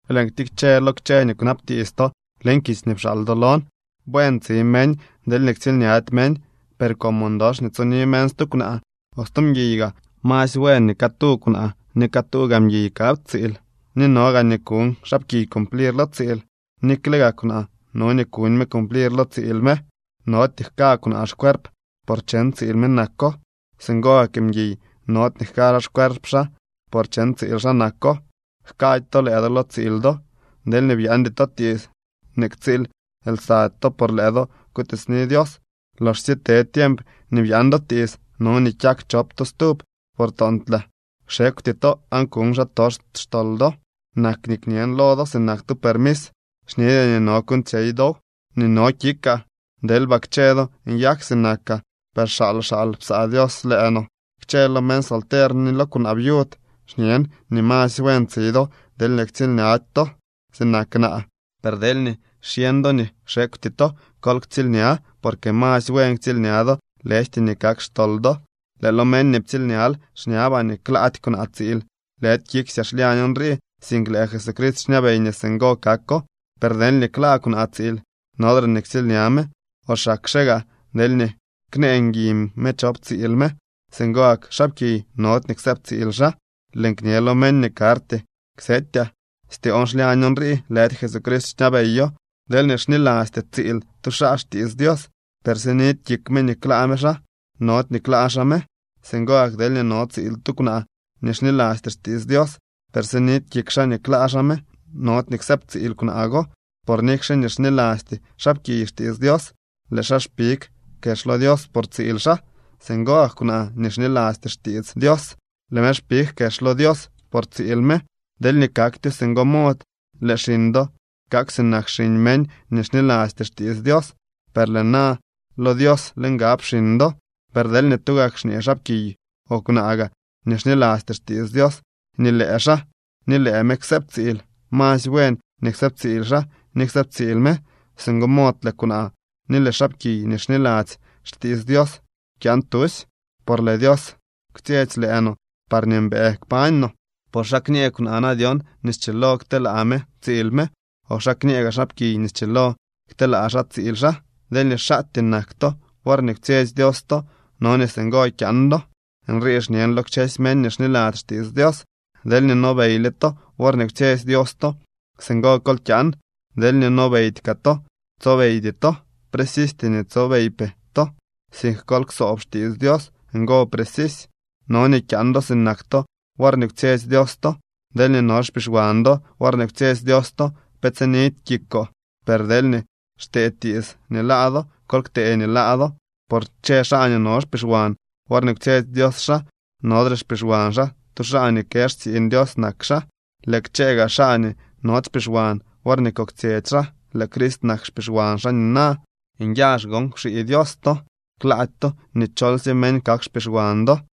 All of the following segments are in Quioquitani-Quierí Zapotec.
Lëën ktikche lo kchë nii kwnabtiits to leñ kitsy nii pxaal do lon. Buen tsi meñ deelñee ktsiilñady meñ. Per como ndox nii tsoni meñ stu kwnaa o stu mguiy gaa, masy buen nii catu kwnaa ni catuu gaa mguiy kap tsiil. Ni no gaa nii kuñ xaapkiy cumplir lo tsiil, nikle gaa kwnaa no nii kuñ me cumplir lo tsiil me. Nody nii jka kwnaa xcuerp, por cheñ tsiil me nako. Singo gak mguiy nody nii jka xaa xcuerp xaa, por cheñ tsiil xaa nako. Jkady to lëë do lo tsiil do, deelñee byaandy to tiits nii ktsiil lsady to por lëë do kutiitsni Dios. Loxsye te tiemp nii byaan do tiits, no nii kyak chop to stub, por toontlaa kxekwty to aan kuñ xaatox xtol do. Nak nii kñen lo do sinak tu permis, xñedyaa nii no kuuñtsyey dow. Nii no kikaa, deelba kchë do nyak sinakaa, per xaal xaal psaa Dios lëë no. Kchë lo meñ solter ni lo kwnaa viud xñen nii masy buen tsi do, deelñee ktsiilñady to, sinak naa. Per deelñee xyeñ do nii kxekwty to, kol ktsiilña, porque masy buen ktsiilña do lëjty nii kak xtol do. Lëë lo meñ nii ptsiilñal xñabaa nii klaady kwnaa tsiil. Lëdy kiksyaa xlyañoo nrii, sink lëë Jesucrist xñabey nii singo kako. Per deelñee klaa kwnaa tsiil, nodre nii ktsiilña me, o xakxe gaa deelñee knee ngui me chop tsiil me. Singo gak xaapkiy nody nii ksëëb tsiil xaa. Lëën kñe lo meñ nii karty ksetyaa, styoon xlyañ nrii, lëdy Jesucrist xñabeyo. Deelñee xnilasty tsiil tu xaa xtiits Dios, per sinidy kik me nii klaa me xaa, nody nii klaa xaa me. Singo gak deelñee no tsiil tu kwnaa nii xnilasty xtiits Dios, per sinidy kik xaa nii klaa xaa me, nody nii ksëëbtsiil kwnaa go. Por nikxe nii xnilasty xaapkiy xtiits Dios, lëë xaa xpig kex lo Dios por tsiil xaa. Singo gak kwnaa nii xnilasty xtiits Dios, lëë me xpig kex lo Dios por tsiil me. Deelñee kaktyo singo mod lëë xiñ do kak sinak xiñ meñ nii xnilasty xtiits Dios, per lëë na lo Dios le ngab xiñ do. Per deelñee tugak xñee xaapkiy o kwnaa gaa nii xnilasty xtiits Dios nii lëë xaa ni lëë me ksëëb tsiil, masy buen nii ksëëbtsiil xaa ni ksëëbtsiil me. Singo mod lëë kwnaa ni lëë xaapkiy nii xniladzy xtiits Dios kyaan tusy, por lëë Dios kwtsyetsy lëë no parñee mbëë kpañ no. Por ¿xa kñë kwnaa na dyon nii schilo kteelaa me tsiil me, o xa kñëë gaa xaapkiy nii schilo kteelaa xaa tsiil xaa? Deelñee xaatyee nak to worñee kwtsyetsy Dios to, no nii singo kyaan do. Nrii xñen lo kchësy meñ nii xniladzy xtiits Dios. Deelñee nobeyle to worñee kwtsyetsy Dios to, singo kol kyaan. Deelñee nobeydy kaa to, tsobeydy to. Precisty nii tsobeypee to, sink kol ksoob xtiits Dios, ngo precisy. No nii kyaan do sinak to worñee kwtsyetsy Dios to. Deelñee no xpixwan do worñee kwtsyetsy Dios to, pe tsinidy kikoo. Per deelñee xtee tiits nii laa do, kol ktee nii laa do. Por kchë xaa nii no xpixwan worñee kwetsy Dios xaa, nodre xpixwan xaa. Tu xaa nii kë xtsiiñ Dios nak xaa. Lëë kchëë gaa xaa nii nody xpixwan worñee koktsyetsy xaa, lëë Crist nak xpixwan xaa nina. Nyazh gon kwxii Dios to. Klaady to nii cholsye meñ kak xpixwan do.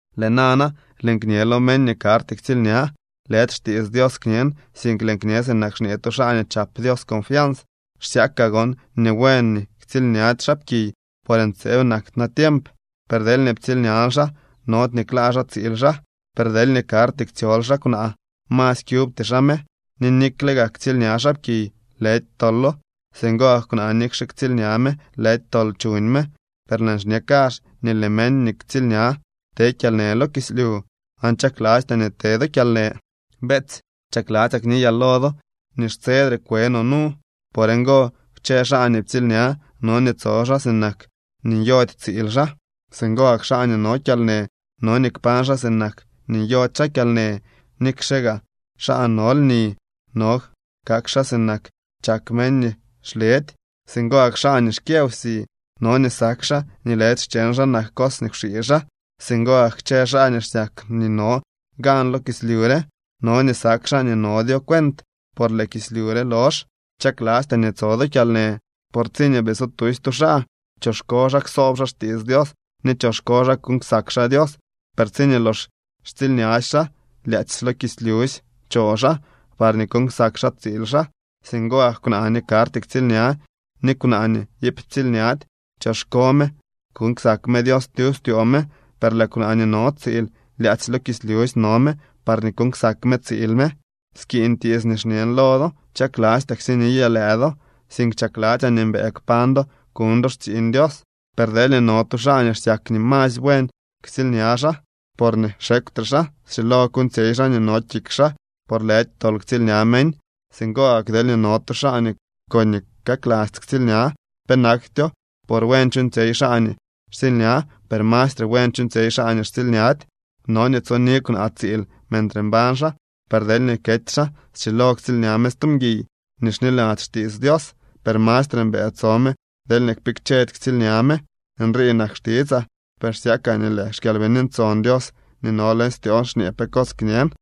Lëë nana lëën kñe lo meñ nii karty ktsiilña, lëdy xtiits Dios kñen, sink lëën kñe sinak xñee tu xaa nii chap Dios confians. Xsyakaa gon nii buen nii ktsiilñady xaapkiy, por ntseeb nak natiemp. Per deelñee ptsiilñal xaa, nody nii klaa xaa tsiil xaa, per deelñee karty ktsyol xaa kwnaa masy kyubty xaa me. Ni nikle gaa ktsiilña xaapkiy, lëdy tolo. Singo gak kwnaa nikxe ktsiilña me, lëdy tol chuñ me. Per lëën xñe kazh nii lëë meñ nii ktsiilña te kyalnë lo kislyu, aan chaklastyaa nii te do kyalnë. Beetsy, chakladzyaa kniyaa lo do nii xtsedre kwe no nu. Por ngo, kchë xaa nii ptsiilña no nii tso xaa sinak nii nyody tsiil xaa. Singo gak xaa nii no kyalnë, no nii kpañ xaa sinak nii nyody xaa kyalnë. Nikxe gaa xaa no lni, no kak xaa sinak chak meñ nii xledy. Singo gak xaa nii xkyë wsi no nii sak xaa nii lëdy xcheñ xaa nak cos nii kwxii xaa. Singo gak kchë xaa nii xsyak nii no gan lo kislyu re, no nii sak xaa nii nodyo cuent, por lëë kislyu re lox. Chaklastyaa nii tso do kyalnë, por tsiñee bii so tusy tu xaa, choxko xaa ksoob xaa xtiits Dios ni choxko xaa kuuñ ksak xaa Dios. Per tsiñee lox xtsiilñasy xaa, lyaadzy lo kislyusy cho xaa, parñee kuuñ ksak xaa tsiil xaa. Singo gak kwnaa nii karty ktsiilña ni kwnaa nii iip ptsiilñady. Choxko me kuuñ ksak me Dios tyub styoo me. Per lëë kwnaa nii no tsiil, lyaadzy lo kislyusy no me, parñee kuuñ ksak me tsiil me. Skiiñ tiits nii xñen lo do. Chaklastyaa ksiniyaa lëë do, sink chakladzyaa nii mbëë kpañ do kuñ do xtsiiñ Dios. Per deelñee no tu xaa nii xsyak nii masy buen ktsiilña xaa, porñee xekwtre xaa. Schilo kuuñtsyey xaa nii no kik xaa, por lëdy tol ktsiilña meñ. Singo gak deelñee no tu xaa nii koñee kaklasty ktsiilña, penaktyo. Por buen chuuñtsyey xaa nii xtsiilña, per mastre buen chuuñtsyey xaa nii xtsiilñady. No nii tsoni kwnaa tsiil mentre mbañ xaa. Per deelñee kety xaa, schilo ktsiilña me stu mguiy nii xniladzy xtiits Dios. Per mastre mbëë tso me deelñee kpikchedy ktsiilña me. Nrii nak xtitsaa, per xsyakaa nii lëë xKyalbini Ntson Dios nii no leñ styoon xñee pe cos kñen.